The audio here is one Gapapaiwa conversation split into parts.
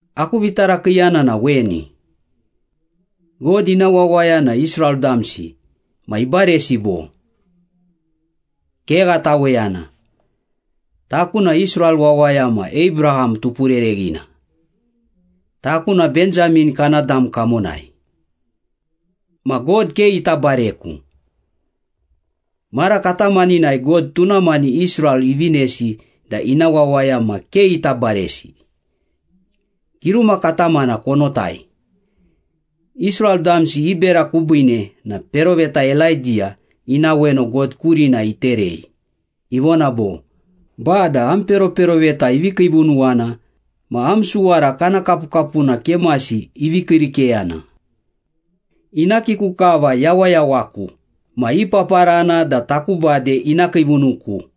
Aku vitarakiiyana na weni. God ina wawaya na Israel damsi ma ibaresi bo? Kegha taweyana! Taku na Israel wawaya ma Abraham tupurereghina. Taku na Benjamin kana dam kamonai. Ma God ke ita bareku. Mara katamaninai God tuna mani Israel ivinesi da ina wawaya ma ke ita baresi. Giruma katamana konotai. Israel damsi i bera kubiine na peroveta Elaidiya ina weno God kurina iterei, ivona bo, “Bada, am peroperoveta ivi kiivunuwana ma am suwara kana kapukapuna kemasi ivi kiirikeyana. Ina kiku kava yawayawaku ma ipaparana da taku bade ina kiivunuku.”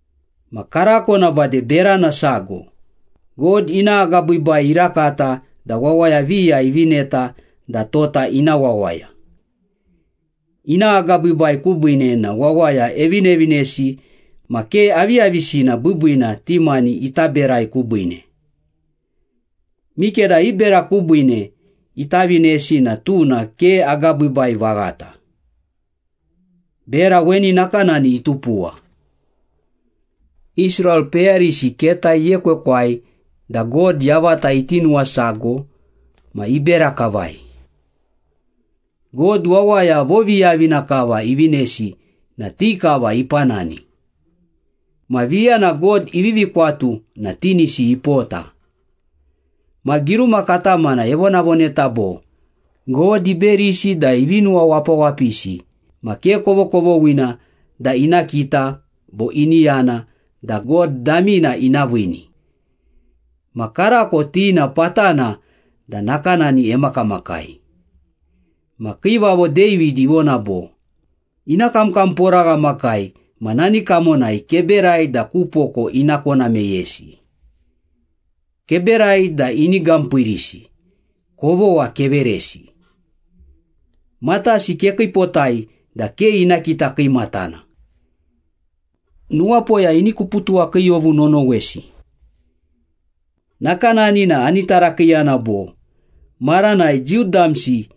Ma karako na bade berana sago, God ina agabiibai irakata da wawaya viya ivineta da tota ina wawaya. Ina agabiibai kubiine na wawaya evinevinesi ma ke aviyavisina biibiina ti mani ita berai kubiine. Mikeda i bera kubiine ita vinesi na tuna ke agabiibai vaghata. Bera weni nakanani itupuwa. Israel peyarisi keta iekwekwai da God yavata iti nuwasago ma ibera kavai. God wawaya voviyavina kava ivinesi na ti kava ipanani. Ma viya na God ivivi kwatu na tinisi ipota. Ma giruma katamana evonavoneta bo, “God iberisi da ivi nuwawapawapisi ma ke kovokovoghina da ina kita bo ini yana da God damina ina viini. Ma karako ti na patana da nakanani emakamakai.” Ma Kiivavo David ivona bo, “Ina kamkamporaghamakai ma nani kamonai keberai da ku poko ina kona meyesi. Keberai da ini gampiirisi! Kovogha keveresi. Matasi kekiipotai da ke ina kita kiimatana. Nuwapoya ini kuputuwakiiyovu nonowesi.” Nakanani na ani tarakiiyana bo, “Maranai Jiu damsi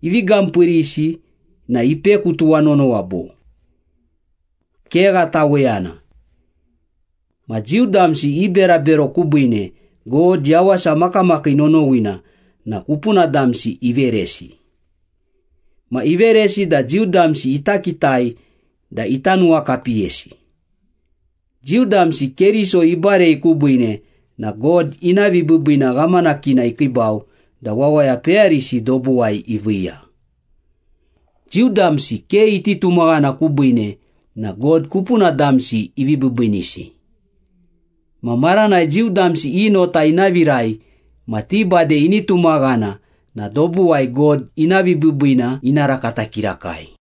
ivi gampiirisi na ipeku tuwanonowa bo?” Kegha taweyana! Ma Jiu damsi i berabero kubiine, God yawasa makamakii nonowina na kupuna damsi iveresi. Ma iveresi da Jiu damsi ita kitai da ita nuwakapiyesi. Jiu damsi Keriso ibarei kubiine na God ina vibiibiina ghamanakina ikiibau da wawaya peyarisi dobuwai iviiya. Jiu damsi ke iti tumaghana kubiine na God kupuna damsi ivi biibiinisi. Ma maranai Jiu damsi i nota ina virai ma ti bade ini tumaghana na dobuwai God ina vibiibiina ina rakata kirakai.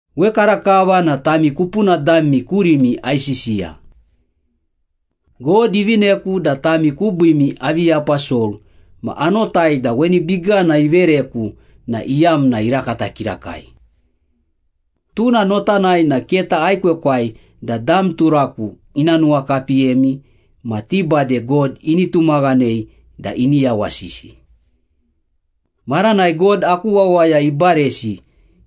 Wekarakava na tami kupuna dami kurimi aisisiya. God ivineku da tami kubiimi avi aposol ma anotai da weni bigana ivereku na iyamna irakata kirakai. Tuna notanai na keta aekwekwai da dam turaku ina nuwakapiyemi ma ti bade God ini tumaghanei da ini yawasisi. Maranai God aku wawaya ibaresi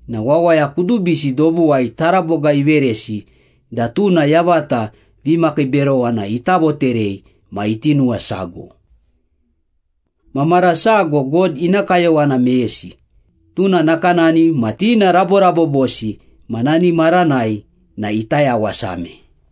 na wawaya kudubisi dobuwai taraboga iveresi da tuna yavata vimakiiberowana ita voterei ma iti nuwasago. Ma mara sago God ina kayowana meyesi, tuna nakanani ma ti na raborabobosi ma nani maranai na ita yawasame.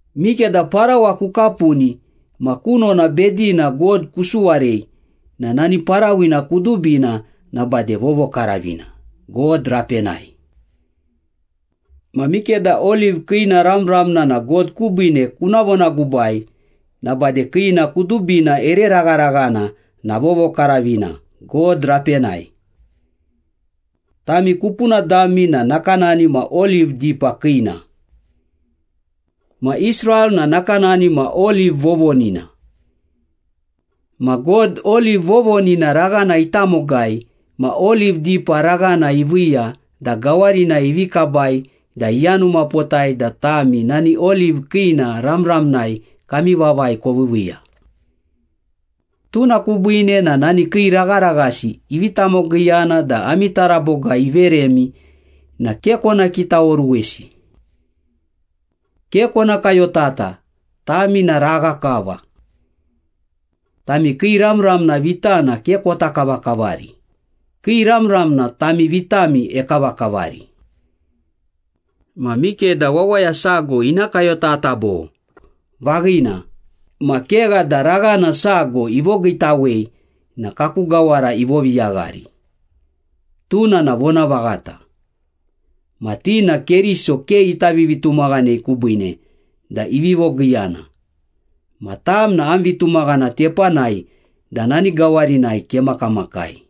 Mikeda parawa kukapuni ma kunona bedina God kusuwarei na nani parawina kudubina na bade vovokaravina, God rapenai. Ma mikeda oliv kiina ramramna na God kubiine kuna vonagubai na bade kiina kudubina ere ragharaghana na vovokaravina, God rapenai. Tami kupuna dami na nakanani ma oliv dipa kiina. Ma Israel na nakanani ma oliv vovonina. Ma God, oliv vovonina raghana itamogai ma oliv dipa raghana iviiya da gawarinai ivi kabai da iyanumapotai da tami nani oliv kiina ramramnai kami vavai koviiviiya. Tuna kubiine na nani kii ragharaghasi ivi tamogiiyana da ami taraboga iveremi na ke kona kitaoruwesi. Ke kona kayotata, tami na ragha kava. Tami kii ramramna vitana ke kota kavakavari, kii ramramna tami vitami ekavakavari. Ma mikeda wawaya sago ina kayotata bo, “Vaghina, ma kegha da raghana sago ivogiitawei na kaku gawara ivoviyaghari.” Tuna na vonavaghata. Ma ti na Keriso ke ita vivitumaghanei kubiine da ivi vogiiyana, ma tam na am vitumaghana tepanai da nani gawarinai kemakamakai.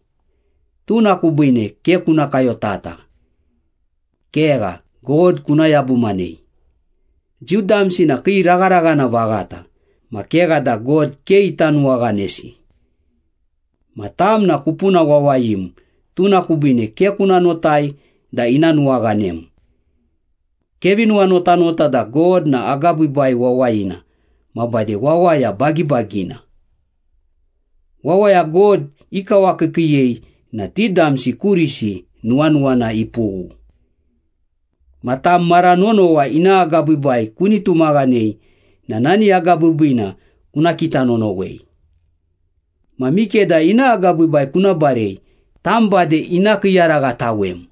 Tuna kubiine ke kuna kayotata. Kegha, God kuna yabumanei. Jiu damsi na kii ragharaghana vaghata, ma kegha da God ke ita nuwaghanesi. Ma tam na kupuna wawayim, tuna kubiine ke kuna notai da ina nuwaghanem. Kevi nuwanotanota da God na agabiibai wawayina ma bade wawaya bagibagina. Wawaya God ikawakiikiiyei na ti damsi kurisi nuwanuwana ipughu. Ma tam mara nonowa ina agabiibai kuni tumaghanei na nani agabiibiina kuna kita nonowei. Ma mikeda ina agabiibai kuna barei, tam bade ina kiiyaraghatawem.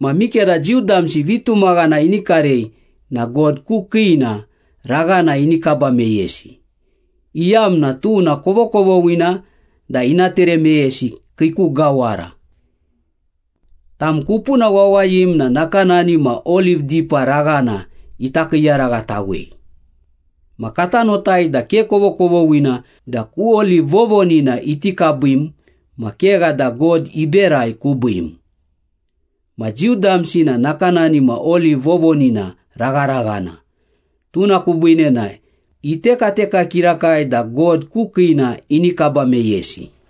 Ma mikeda Jiu damsi vitumaghana ini karei na God ku kiina raghana ini kaba meyesi, iyamna tuna kovokovoghina da ina tere meyesi kii ku gawara. Tam kupuna wawayim na nakanani ma oliv dipa raghana ita kiiyaraghatawei, ma kata notai da ke kovokovoghina da ku oliv vovonina iti kabim ma kegha da God iberai kubiim. Ma Jiu damsi na nakanani ma oliv vovonina ragharaghana, tuna kubiine na itekateka kirakai da God ku kiina ini kaba meyesi.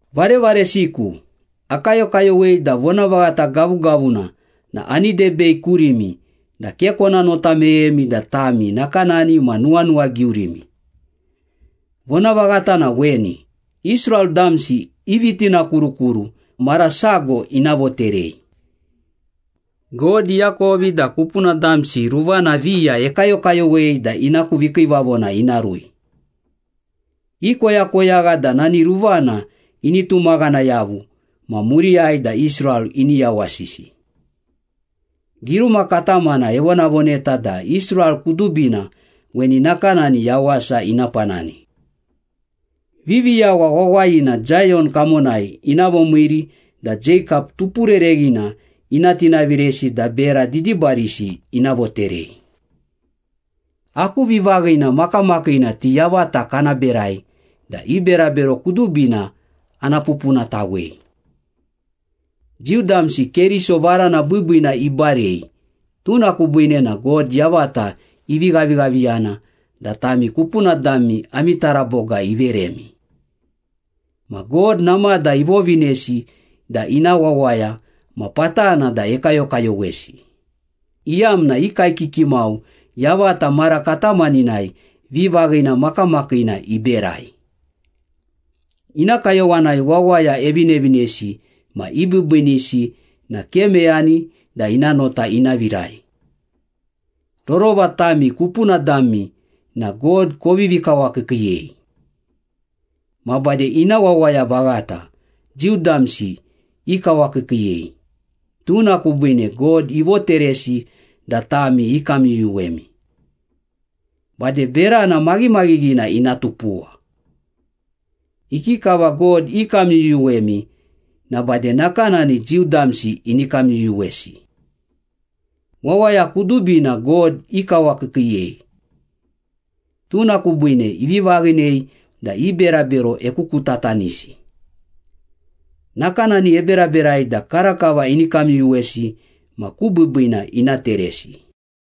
Varevaresiku, akayokayowei da vonavaghata gavugavuna na ani debei kurimi da ke kona nota meyemi da tami nakanani ma nuwanuwagiurimi. Vonavaghata na weni, Israel damsi i vitinakurukuru mara sago ina voterei. God iakovi da kupuna damsi ruvana viya ekayokayowei da ina ku vikiivavona ina rui. Ikoyakoyagha da nani ruvana ini tumaghana yavu ma muriyai da Israel ini yawasisi. Giruma katamana evonavoneta da Israel kudubina weni nakanani yawasa ina panani. “Viviyawa wawayina Zayon kamonai ina vomiiri, da Jeikap tupurereghina ina tinaviresi da bera didibarisi ina voterei. Aku vivaghina makamakiina ti yavata kana berai da i berabero kudubina ana pupunatawei.” Jiu damsi Keriso varana biibiina ibarei, tuna kubiine na God yavata ivi ghavighaviyana da tami kupuna dami ami taraboga iveremi. Ma God namada ivovinesi da ina wawaya ma patana da ekayokayowesi, iyamna i kaekiki mau yavata mara katamaninai vivaghina makamakiina iberai. Ina kayowanai wawaya evinevinesi ma ibiibiinisi na ke meyani da ina nota ina virai. Rorova tami kupuna dami na God kovivi kawakiikiiyei. Ma bade ina wawaya vaghata, Jiu damsi ikawakiikiiyei, tuna kubiine God ivoteresi da tami ikamyuyuwemi. Bade berana maghimaghinina ina tupuwa. Ikikava God ikamyuyuwemi na bade nakanani Jiu damsi ini kamyuyuwesi. Wawaya kudubina God ikawakiikiiyei. Tuna kubiine ivi vaghinei da i berabero ekukutatanisi. Nakanani eberaberai da karakava ini kamyuyuwesi ma ku biibiina ina teresi.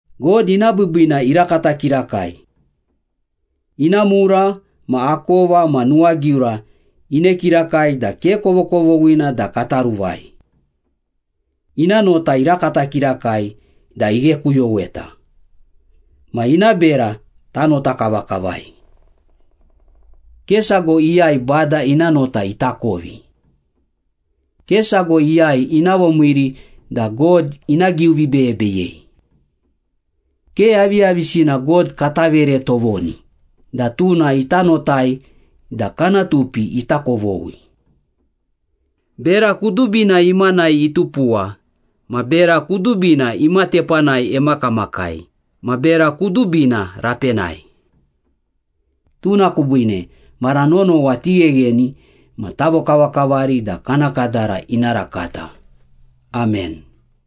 God ina biibiina irakata kirakai. Ina mura ma akova ma nuwagiura ine kirakai da ke kovokovoghina da kata ruvai. Ina nota irakata kirakai da ighekuyoweta. Ma ina bera tanota kavakavai. “Ke sago iyai Bada ina nota itakovi. Ke sago iyai ina vomiiri da God ina giuvibeyebeyei. Ke aviyavisina God kata vere tovoni da tuna ita notai da kana tupi ita kovoghi.” Bera kudubina imanai itupuwa ma bera kudubina ima tepanai emakamakai ma bera kudubina rapenai. Tuna kubiine mara nonowa tighegheni ma tavokavakavari da kana kadara ina rakata. Amen.